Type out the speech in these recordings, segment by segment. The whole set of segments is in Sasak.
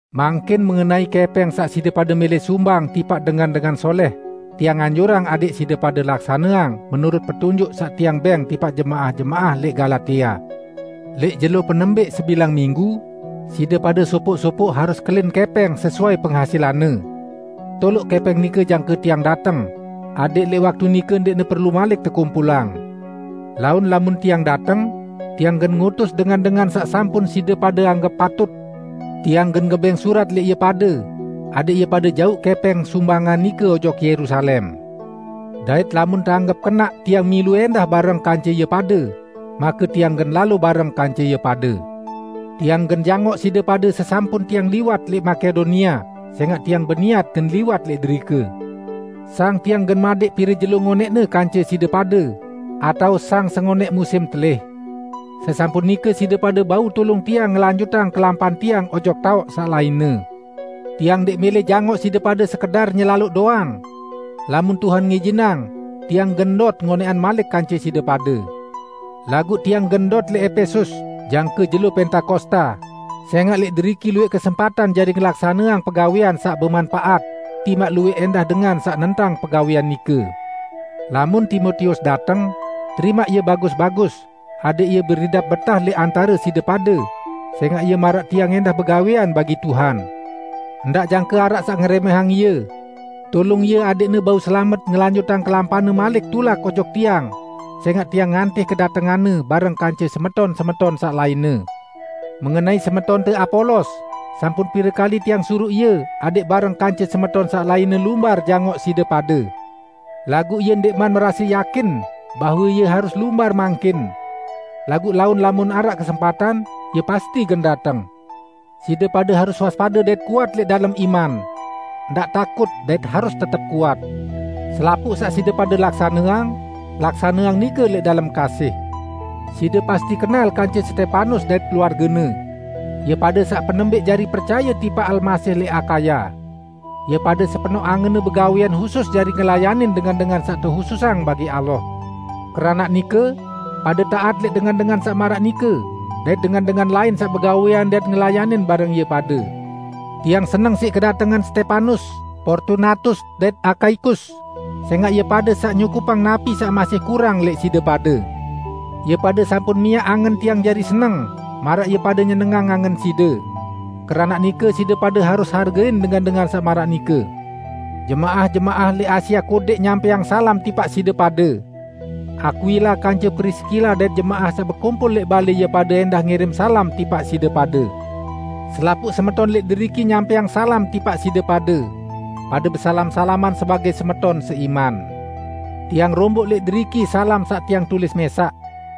Mangkin mengenai kẽpẽng saq side pade mẽlẽ sumbang tipaq dengan-dengan solẽh, tiang anjurang adẽq side pade laksaneang menurut petunjuk saq tiang bẽng tipaq jemaah-jemaah lẽq Galatia. Lẽq jelo penembẽq sebilang minggu, side pade sopoq-sopoq harus kelin kẽpẽng sesuai penghasilanne sesuai pengasilande. Toloq kẽpẽng nike jangke tiang dateng, adẽq lẽq waktu nike ndẽqne perlu malik tekumpulang. Laun lamun tiang dateng, tiang gen ngutus dengan-dengan saq sampun side pade anggep patut. Tiang gen ngebẽng surat lẽq ie pade, adẽq ie pade jauq kẽpẽng sumbangan nike ojok Yerusalem. Dait lamun teanggep kenaq tiang milu ẽndah bareng kance ie pade, make tiang gen lalo bareng kance ie pade. Tiang gen jangoq side pade sesampun tiang liwat lẽq Makedonia, sẽngaq tiang beniat gen liwat lẽq derike. Sang tiang gen madẽq piro jelo ngonẽqne kance side pade, atao sang sengonẽq musim telih. Sesampun nike side pade bau tulung tiang ngelanjutang kelampan tiang ojok taoq saq lainne. Tiang ndẽq mẽlẽ jangoq side pade sekedar nyelaloq doang. Lamun Tuhan ngijinang, tiang gen ndot ngonẽqan malik kance side pade. Laguq tiang gen ndot lẽq Epesus, jangke jelo Pentakosta, sẽngaq lẽq deriki luwẽq kesempatan jari ngelaksaneang pegawẽan saq bemanpaat, timaq luwẽq ẽndah dengan saq nentang pegawẽan nike. Lamun Timotius dateng, terimaq ie bagus-bagus adẽq ie beridap betah lẽq antare side pade, sẽngaq ie maraq tiang ẽndah begawẽan bagi Tuhan. Ndaq jangke araq saq ngerẽmẽhang ie. Tulung ie adẽqne bau selamet ngelanjutang kelampanne malik tulak ojok tiang, sẽngaq tiang ngantih kedatenganne bareng kance semeton-semeton saq lainne. Mengenai semetonte Apolos, sampun pire kali tiang suruq ie adẽq bareng kance semeton saq lainne lumbar jangoq side pade. Laguq ie ndẽqman merase yakin bahwe ie harus lumbar mangkin. Laguq laun lamun araq kesempatan, ie pasti gen dateng. Side pade harus waspade dait kuat lẽq dalem iman. Ndaq takut dait harus tetep kuat. Selapuq saq side pade laksaneang, laksaneang nike lẽq dalem kasih. Side pasti kenal kance Stepanus dait keluargene; ie pade saq penembẽq jari percaye tipaq Almasih lẽq Akaya. Ie pade sepenoq angenne begawẽan husus jari ngelayanin dengan-dengan saq tehususang bagi Allah. Keranaq nike, pade taat lẽq dengan-dengan saq maraq nike, dait dengan-dengan lain saq begawẽan dait ngelayanin bareng ie pade. Tiang seneng siq kedatengan Stepanus, Portunatus dait Akaikus, sẽngaq ie pade saq nyukupang napi saq masih kurang lẽq side pade. Ie pade sampun miaq angen tiang jari seneng, maraq ie pade nyenengang angen side. Keranaq nike, side pade harus hargein dengan-dengan saq maraq nike. Jemaah-jemaah lẽq Asia Kodẽq nyampẽang salam tipaq side pade. Akwila kance Priskila dait jemaah saq bekumpul lẽq balẽ ie pade ẽndah ngirim salam tipaq side pade. Selapuq semeton lẽq deriki nyampẽang salam tipaq side pade. Pade besalam-salaman sebagẽ semeton seiman. Tiang romboq lẽq deriki salam saq tiang tulis mẽsaq: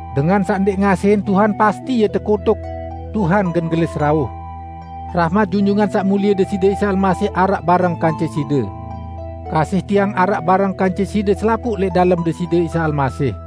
Dengan saq ndẽq ngasihin Tuhan, pasti ie tekutuk! Tuhan gen gelis rauh! Rahmat Junjungan Saq Mulie, Deside Isa Almasih araq bareng kance side. Kasih tiang araq bareng kance side selapuq lẽq dalem Deside Isa Almasih.